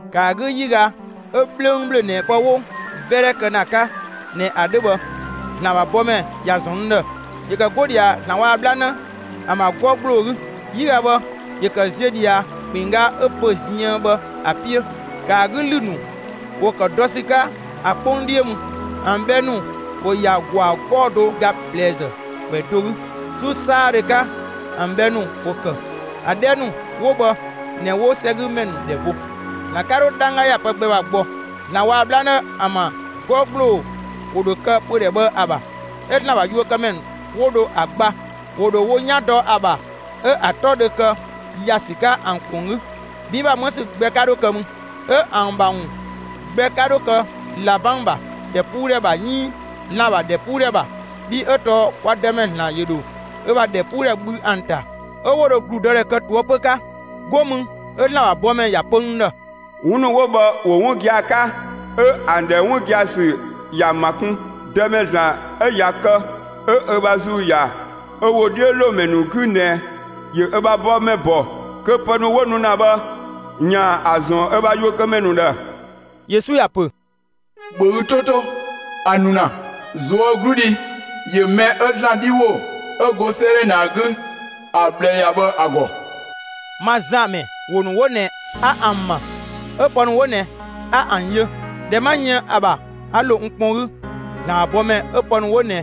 ‑Kë ‑a 'gü 'yiga 'ö 'bhlöngbhlöng ꞊nɛ pë 'wo 'vɛdhɛ kë ‑na ‑a 'ka ꞊nɛ ‑a 'dhö bhë, ‑Zlan ‑bha bɔmɛ ‑ya ‑zɔn n ‑dhë. ‑Yö ‑kë 'go ꞊dhia ‑Zlan waa‑ 'bhlanë ‑an ‑bha 'gɔ ‑gbloo 'gü. 'Yiga bhë ‑yö ‑kë ziö ꞊dhia ‑kpinngga 'ö pö‑ ziën bhë ‑a 'piö. ‑Kë ‑a 'gü ‑lü ‑nu ‑wo ‑kë dɔ ‑sü 'ka ‑a 'kpong 'dhiö mü. ‑An bhɛ ‑nu ‑wo ‑ya ‑gwaa 'gɔɔ‑ do ga ꞊plɛzë ‑kwɛ do 'gü. 'Su 'saadhö 'ka, ‑an bhɛ ‑nu ‑wo ‑kë. ‑A 'dhɛ ‑nu 'wo bhë ꞊nɛ 'wo 'sɛgümɛ ‑nu ‑dhɛ bo. ‑Zlan 'ka 'dho 'dhangga ‑ya pë gbɛ ‑bha gbɔ. ‑Zlan waa‑ 'bhlanë ‑an ‑bha 'gɔ ‑gbloo ‑wo ‑dho kë pödhɛ bhë ‑a ‑bha, 'ö ‑Zlan ‑bha yuökëmɛ ‑nu 'wo dho ‑a gba. ‑Wo ‑dho wo 'yan dɔ ‑a ‑bha; 'ö ‑a 'tɔ dhö kë ‑ya ‑sü 'ka ‑an ‑kpong 'gü. 'Bin ‑bha 'më ‑sü gbɛ 'ka 'dho kë mü, 'ö ‑an ‑bha ‑wun gbɛ 'ka 'dho kë ꞊labang ‑bha ‑dhɛpuudhɛ ‑bha 'iin lan‑ ‑bha ‑dhɛpuudhɛ ‑bha, bhii 'ö tɔɔ kwa Dëmɛ ‑Zlan ‑yö ‑dho ö ‑bha ‑dhɛpuudhɛ bhü ‑an ‑ta, 'ö 'wo dho ‑gludëdhɛ kë ꞊toëpö 'ka. 'Go mü 'ö ‑Zlan ‑bha bɔmɛ ‑ya pö n ‑dhë: «'Wun ‑nu 'wo bhë ‑wo 'wun gia‑ 'ka 'ö ‑an ‑dhɛ 'wun gia‑ ‑sü ‑ya ‑ma kun. Dëmɛ ‑Zlan 'ö ꞊ya kë 'ö ö ‑bha ‑Zuu ‑ya ö ‑wodhiölomɛ ‑nu 'gü ꞊nɛ ‑yö ö ‑bha bɔmɛ ‑bɔ kö pë ‑nu 'wo nu ‑na bhë, ‑yaan ‑a ‑zɔn ö ‑bha yuökëmɛ ‑nu ‑dhë.» Yesu ‑ya ‑pö: «‑Bhö ü 'to 'to! A nu ‑na; ꞊zuögludhi ‑yö mɛ 'ö ‑Zlan 'dhi ‑wo 'ö go 'sëëdhɛ ꞊nɛ ‑a 'gü ‑a ꞊bhlë ‑ya bhë ‑a ‑gɔ.» Ma Zan ‑mɛ, ‑wo ‑nu 'wo ꞊nɛ 'a ‑an ‑ma, 'ö pë ‑nu 'wo ꞊nɛ 'a ‑an yö. ꞊Dhɛ 'ma yën ‑a ‑bha, 'a ‑lo n kpɔn 'gü ‑Zlan ‑bha bɔmɛ 'ö pë ‑nu 'wo ꞊nɛ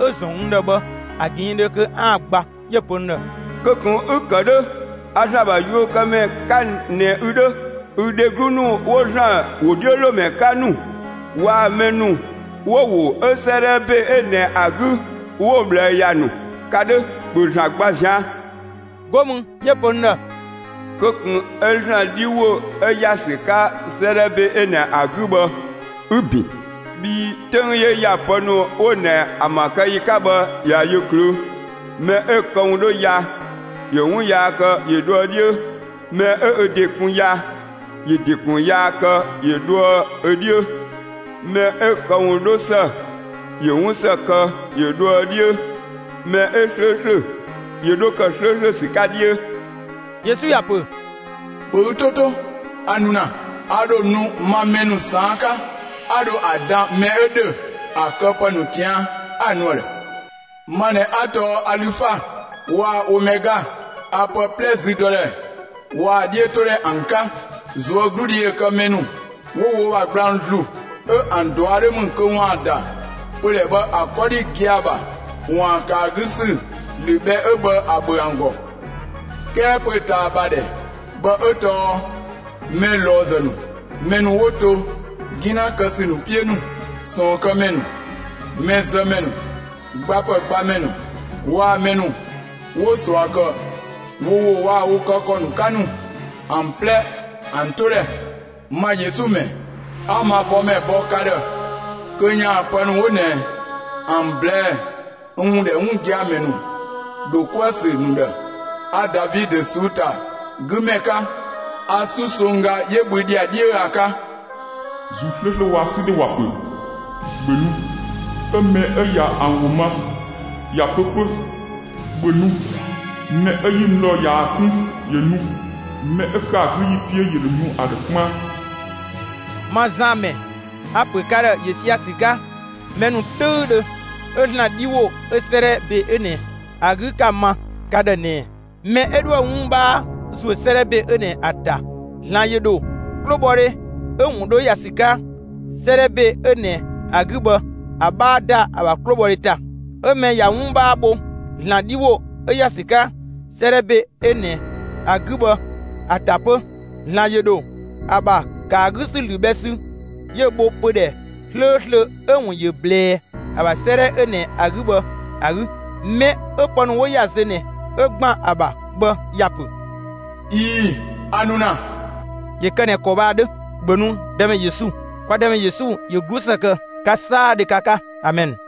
'ö‑ ‑zɔn n ‑dhë bhë ‑a ꞊gɛɛndhö kö 'aan‑ gba. 'Yö‑ pö n ‑dhë: «Kö ꞊kun 'ü‑ ‑kë 'dhö! A ‑Zlan ‑bha yuökëmɛ 'ka ꞊nɛ ü 'dhö, ü dheglu ‑nu 'wo ‑Zlan ‑wodhiölomɛ 'ka ‑nu waa‑ mɛ ‑nu 'wo ‑wo 'ö 'sëëdhɛ ‑be 'ö ꞊nɛ ‑a 'gü 'wo‑ ꞊bhlë ‑ya ‑nu, ka 'dhö. ‑Bhö ‑Zlan gba ꞊zian'!» 'Go mü 'yö‑ pö n ‑dhë: «Kö ꞊kun 'ö ‑Zlan 'dhi ‑wo 'ö ‑ya ‑sü 'ka 'sëëdhɛ ‑be ꞊nɛ ‑a 'gü bhë 'ü‑ ‑bin, bhii 'töng 'yö ‑ya pë ‑nu 'wo ꞊nɛ ‑an ‑bha kë ‑yi 'ka bhë ꞊ya yö ꞊klöö'. Mɛ 'ö‑ këwun 'dho ya, ‑yö 'wun yaa kë ‑yö dhoë 'dhiö; mɛ 'ö ö ‑de kun ya, ‑yö ‑de ‑kun yaa kë ‑yö dhoë ö 'dhiö; mɛ 'ö‑ këwun 'dho ‑së ‑yö 'wun ‑së kë, ‑yö dhoë 'dhiö, mɛ 'ö 'slööslö ‑yö 'dho ‑kë 'slööslö ‑sü 'ka 'dhiö.» Yesu ‑ya ‑pö: «‑Bhö ü 'to to! A nu ‑na! A ‑dho nu ma mɛ ‑nu ꞊saan' 'ka; 'a dho ‑a dan mɛ 'ö ‑dhö ‑a këpë ‑nu ꞊tian' 'a‑ nu ‑a ‑dhë. Ma ꞊nɛ 'a tɔɔ Alüfa waa‑ Omɛga; a pë 'plɛ züdɔdhɛ waa‑ ‑a 'dhiötodhɛ ‑an 'ka.» ꞊Zuögludhi ‑yö kë mɛ ‑nu 'wo wo ‑bha gblang ‑zlu, 'ö ‑an ꞊dua' 'dho ‑mü kö ‑waan ‑da pödhɛ bhë ‑a 'kɔdhi gia‑ ‑bha ‑waan ‑kë ‑a 'gü ‑sü ‑lü bhɛ 'ö bhë ‑a ‑bhö ‑an ‑gɔ. 'Kɛɛ pö‑ ꞊taa ‑bha ‑dhɛ bhë 'ö tɔɔ mɛ ꞊lɔɔzë ‑nu, mɛ ‑nu 'wo to 'gina kë ‑sü ‑nu 'piö ‑nu, ꞊sɔɔnkëmɛ ‑nu, mɛzëmɛ ‑nu, ‑gbapë gbamɛ ‑nu waa‑ mɛ ‑nu 'wo ꞊sua ‑kë wo ‑wo waa‑ wo kë ‑kɔ ‑nu 'ka ‑nu ‑an 'plɛ ‑an 'to ‑dhɛ. «Ma Yesu ‑mɛ, 'a ma bɔmɛ ‑bɔ ka ‑dhë kö ‑yaan pë ‑nu 'wo ꞊nɛ ‑an ꞊blɛɛ'‑ n ‑wun ‑dhɛ 'wun gia‑ ‑mɛ ‑nu ‑dho 'kuë‑ ‑sü ‑nu ‑dhë. A Davidö ꞊suu'‑ ‑ta 'gü ‑mɛ 'ka; a 'susongga 'yö bhü ‑dhiadhiö ‑a 'ka.» ‑Zuu 'slööslö waa‑ 'sü dhe ‑wa ‑pö: «‑Bhö nu!» 'Ö mɛ 'ö ꞊ya ‑an ‑wo ma, ‑ya pö 'pö: «‑Bhö nu!» Mɛ 'ö 'yi mü ‑dhɔ ꞊yaa‑ 'kun ‑yö nu; mɛ 'ö ‑kë ‑a 'gü ‑yi 'piö ‑yö ‑dho nu ‑a ‑dhë 'kpaan. Ma Zan ‑mɛ, a‑ ‑pö ka ‑dhë ‑yö sia‑ ‑sü 'ka mɛ ‑nu 'töüdhö 'ö ‑Zlan 'dhi ‑wo 'ö 'sëëdhɛ ‑be 'ö ꞊nɛ ‑a 'gü 'ka‑ ma ka ‑dhë ꞊nɛɛ: Mɛ 'ö 'dhoë‑ 'wun 'bhaa ‑zuö 'sëëdhɛ ‑be 'ö ꞊nɛ ‑a ‑ta, ‑Zlan ‑yö ‑dho 'klobhɔdhe 'ö‑ ‑wun 'dho ‑ya ‑sü 'ka 'sëëdhɛ ‑be 'ö ꞊nɛ ‑a 'gü bhë ‑a 'bhaa ‑da ‑a ‑bha 'klobhɔdhe ‑ta. 'Ö mɛ ꞊ya 'wun 'bhaa bho ‑Zlan 'dhi ‑wo 'ö ‑ya ‑sü 'ka 'sëëdhɛ ‑be 'ö ꞊nɛ ‑a 'gü bhë ‑a ‑ta 'pö, ‑Zlan ‑yö ‑dho ‑a ‑bha ‑kë ‑a 'gü ‑lü bhɛ sü, 'yö‑ bho pödhɛ 'slööslö 'ö‑ ‑wun ‑yö ꞊blɛɛ ‑a ‑bha 'sëëdhɛ 'ö ꞊nɛ ‑a 'gü bhë ‑a 'gü. Mɛ 'ö pë ‑nu 'wo ‑ya zö ꞊nɛ 'ö ‑gban ‑a ‑bha bhë ‑ya pö: «꞊Ii‑, a nu ‑na!» ‑Yö kë ꞊nɛ ‑kɔ bhë ‑a 'dhö! ‑Bhö nu Dëmɛ Yesu! Kwa Dëmɛ Yesu ‑yö 'glusë kë ka 'saadhö ka 'ka! Amɛn!